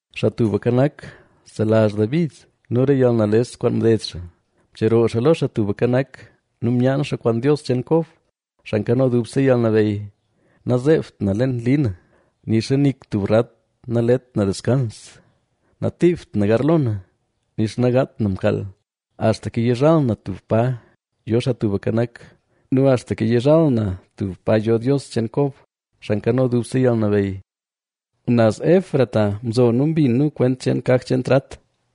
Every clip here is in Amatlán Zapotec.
Xaa Tubka Nak, selazh David nu re yalnales kwaan mded xaa. Mcheroo xaa lo Xaa Tubka Nak nu myaan xaa kwaan Dios cheen Kob, Xaa Nkano Dubse Yalnabeyy: “Nazeebt na leen li na, nixa nik tub rat nalet na deskans; natiibt na garlo na, nixa nagaat na mkaal, axtaka yizhal na tub pa yo Xaa Tubka Nak nu axtaka yizhal na tub pa yo Dios cheen Kob, Xaa Nkano Dubse Yalnabeyy.” Naz Efrata mzo nu mbin nu kwent cheen kaj cheen trat;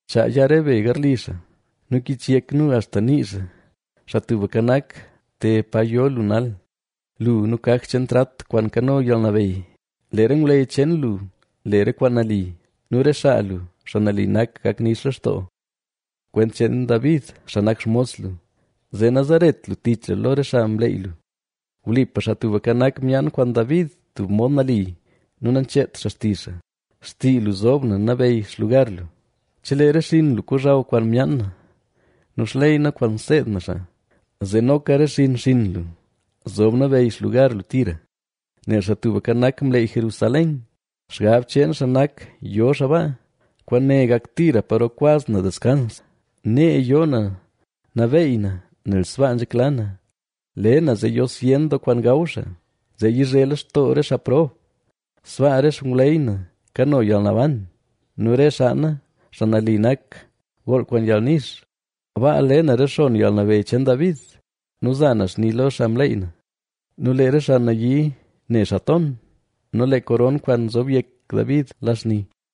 Chaa ya re be garli xaa; Nu kichyek nu axta nii xaa. Xaa Tubka Nak te pa yo lu nal, lu nu kaj cheen trat kwaan nkano yalnabeyy. Lee re ngwleyy cheen lu le re kwaan nali nu re xaa lu, xaa nali nak, gak nix lextoo. Kwent cheen David xaa nak xmos lu, zee nazeret lu tich lu lo re xaa mleey lu. Wlipa Xaa Tubka Nak myaan kwaan David tub mod nali nu nacheet xaa xtizh xaa: “Xtii lu zob na nabeyy xlugar lu, chelee re xinn lu kozhaw kwaan myaan na nu xley na kwaan seed na xaa, zee noka re xinn xinn lu, zob nabeyy xlugar lu tira.” Nel Xaa Tubka Nak mleey Jerusalén; xgab cheen xaa nak yo xaa baa: “Kwaane gak tira paro kwaz na deskans; nee yoo na nabeey na, nel sbaa nzhekla na. Le na zee yo zyen doo kwaan gaw xaa, zee yizhe lextoo re xaa prob. Sbaa re xngwleyy na kano yalnaban nu re xaa na, xaa nali nak, gool kwaan yalnix. Baa le na rexonn yalnabeyy cheen David nu za na xni lo xaa mleey na. Nu lee re xaa nayii ne xaa ton nu lee koron kwaan nzob yek David la xni.”